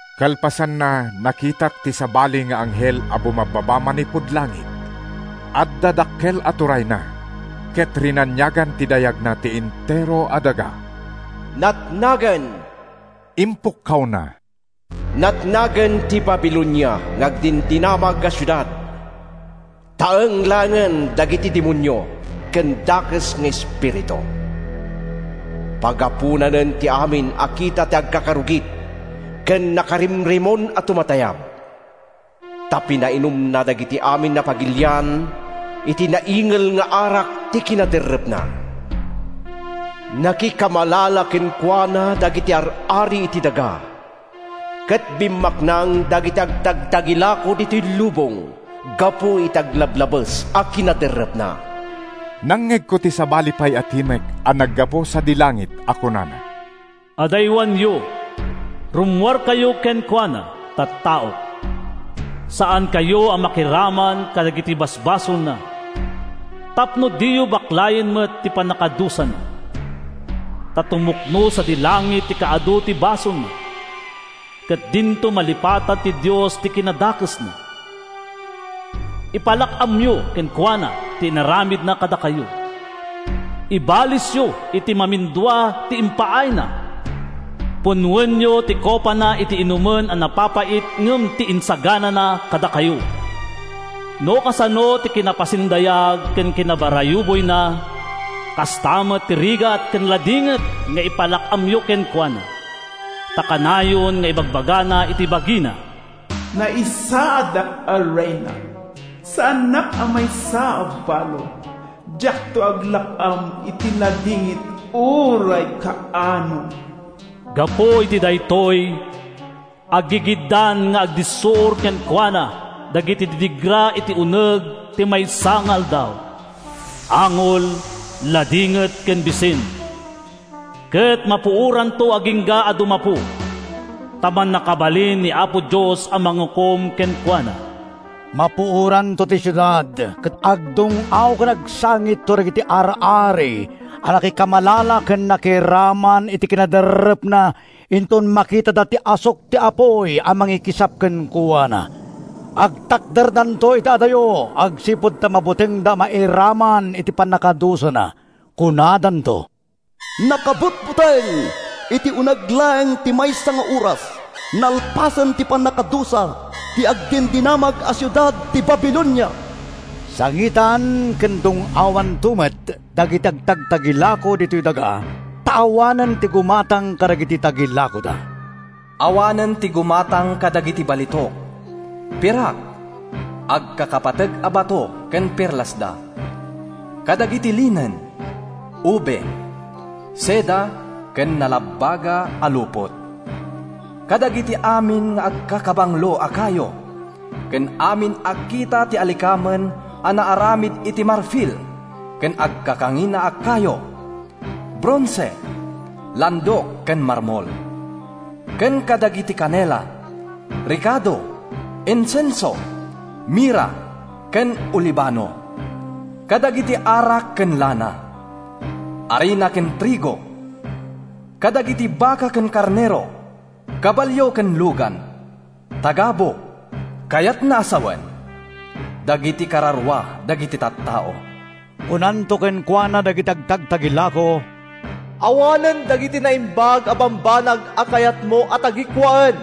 Kalpasanna, nakitak ti sabali nga anghel a bumabbaba manipud langit. Adda dakkel a turayna ket rinaniagan ti dayagna ti entero a daga. “Natnagen!” impukkawna. “Natnagen ti Babilonia nga agdindinamag a siudad! Taeng laengen dagiti demonio ken dakes nga espiritu. Pagaponanen ti amin a kita ti agkakarugit ken nakarimrimon a tumatayab. Ta pinainumna dagiti amin a pagilian iti naingel nga arak ti kinaderrepna. Nakikamalala kenkuana dagiti ar-ari iti daga, ket bimmaknang dagiti agtagtagilako ditoy lubong gapu iti aglablabes a kinaderrepna.” Nangngegko ti sabali pay a timek a naggapu sadi langit a kunana: “Adaywanyo, rummuarkayo kenkuana, tattaok! Saankayo a makiraman kadagiti basbasolna, tapno diyo baklayen met ti pannakadusana! Ta tumukno sadi langit ti kaadu ti basolna, Ket dinto malipatan ti Dios ti kinadakesna. Ipalak-amyo kenkuana ti inaramidna kadakayo. Ibalesyo iti mamindua ti impaayna. Punnoenyo ti kopana iti inumen a napapait ngem ti insaganana kadakayo. No kasano ti kinapasindayag ken kinabarayuboyna, Kasta met ti rigat ken ladingit nga ipalak-amyo kenkuana. Ta kanayon nga ibagbagana iti bagina: ‘Naisaadak a reyna, saanak a maysa a balo. Diakto aglak-am iti ladingit uray kaano!’ Gapu iti daytoy, aggigiddan nga agdissuor kenkuana dagiti didigra iti uneg ti maysa nga aldaw, Angol, ladingit ken bisin. Ket mapuoranto agingga a dumapu, ta mannakabalin ni Apo Dios a mangukom kenkuana.” Mapuoranto ti siudad ket agdung-aw ken agsasangitto dagiti ar-ari a nakikamalala ken nakiraman iti kinaderrepna inton makitada ti asuk ti apuy a mangikisap kenkuana. Agtakderdanto iti adayo agsipud ta mabutengda a mairaman iti pannakadusana. Kunadanto: “Nakabutbuteng! Iti uneg laeng ti maysa nga oras, nalpasen ti pannakadusa ti agdindinamag a siudad ti Babilonia!” Sangitan ken dung-awanto met dagiti agtagtagilako ditoy daga ta awanen ti gumatang kadagiti tagilakoda. Awanen ti gumatang kadagiti balitok, pirak, agkakapateg a bato ken perlasda; kadagiti linen, ube, seda ken nalabaga a lupot; kadagiti amin nga agkakabanglo a kayo ken amin a kita ti alikamen a naaramid iti marfil ken agkakangina a kayo, bronse, landok ken marmol; ken kadagiti kanela, rekado, insenso, mirra ken olibano; kadagiti arak ken lana, arina ken trigo; kadagiti baka ken karnero, kabalio ken lugan, tagabu, kayatna a sawen, dagiti kararua dagiti tattao. Kunanto kenkuana dagiti agtagtagilako: “Awanen dagiti naimbag a bambanag a kayatmo a tagikuaen,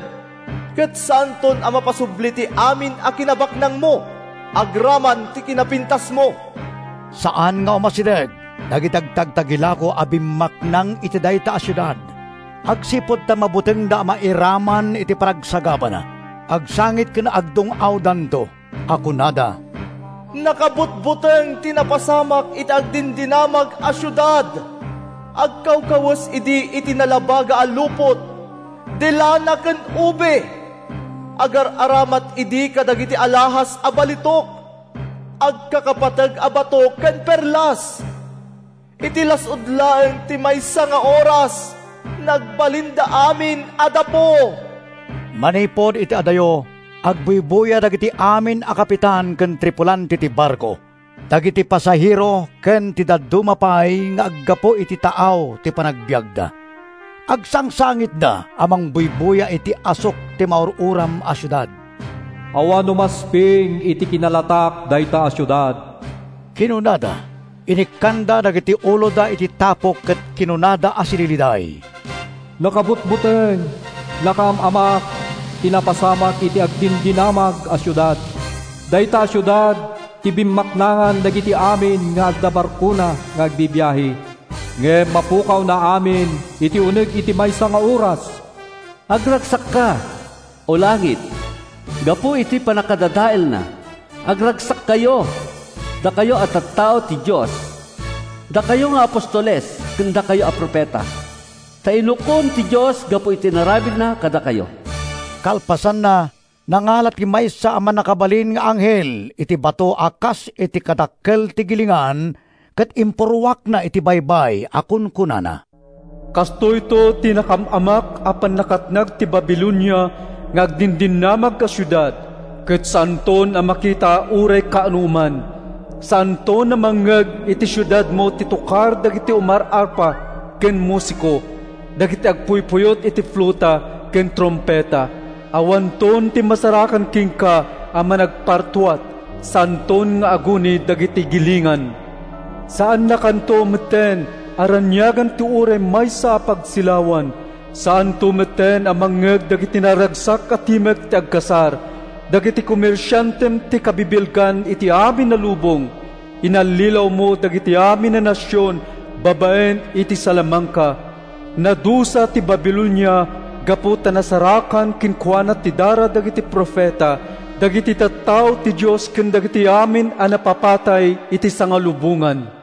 ket saanton a mapasubli ti amin a kinabaknangmo agraman ti kinapintasmo!” Saan nga umasideg dagiti agtagtagilako a bimmaknang iti dayta a siudad agsipud ta mabutengda a mairaman iti panagsagabana. Agsangit ken agdung-awdanto, a kunada, “Nakabutbuteng ti napasamak iti agdindinamag a siudad! Agkawkawes idi iti nalabaga a lupot, de lana ken ube. Agar-aramat idi kadagiti alahas a balitok, agkakapateg a bato ken perlas! Iti las-ud laeng ti maysa nga oras, nagbalinda amin a dapu!” Manipud iti adayo, agbuybuya dagiti amin a kapitan ken tripulante ti barko, dagiti pasahero ken ti dadduma pay nga aggapu iti taaw ti pagbiagda. Agsangsangitda a mangbuybuya iti asuk ti maur-uram a siudad. “Awan umasping iti kinalatak dayta a siudad!” kinunada. Inikkanda dagiti uloda iti tapok ket kinunada a sililiday: “Nakabutbuteng! Nakaam-amak ti napasamak iti agdindinamag a siudad! Dayta a siudad ti bimmaknangan dagiti amin nga adda barkona nga agbibiahe. Ngem napukawna amin iti uneg ti maysa nga oras!” Agragsakka, O langit, gapu iti pannakadadaelna; agragsakkayo, dakayo a tattao ti Dios, dakayo nga apostoles ken dakayo a profeta! Ta inukom ti Dios gapu iti inaramidna kadakayo! Kalpasanna, nangala ti maysa a mannakabalin nga anghel iti bato a kas iti kadakkel ti gilingan ket impurruakna iti baybay a kunkunana: “Kastoyto ti nakaam-amak a pannakatnag ti Babilonia nga agdindinamag a siudad, ket saanton a makita uray kaanoman. Saanton a mangngeg iti siudadmo ti tokar dagiti umaarpa ken musiko, dagiti agpuypuyot iti fluta ken trumpeta. Awanton ti masarakan kenka a managpartuat. Saanton nga aguni dagiti gilingan! Saannakanto metten a raniagan ti uray maysa a pagsilawan; saanto metten a mangngeg dagiti naragsak a timek ti agkasar. Dagiti komersiantem ti kabibilgan iti amin a lubong. Inallilawmo dagiti amin a nasion babaen iti salamangka.” Nadusa ti Babilonia gapu ta nasarakan kenkuana ti dara dagiti profeta, dagiti tattao ti Dios ken dagiti amin a napapatay iti sangalubongan.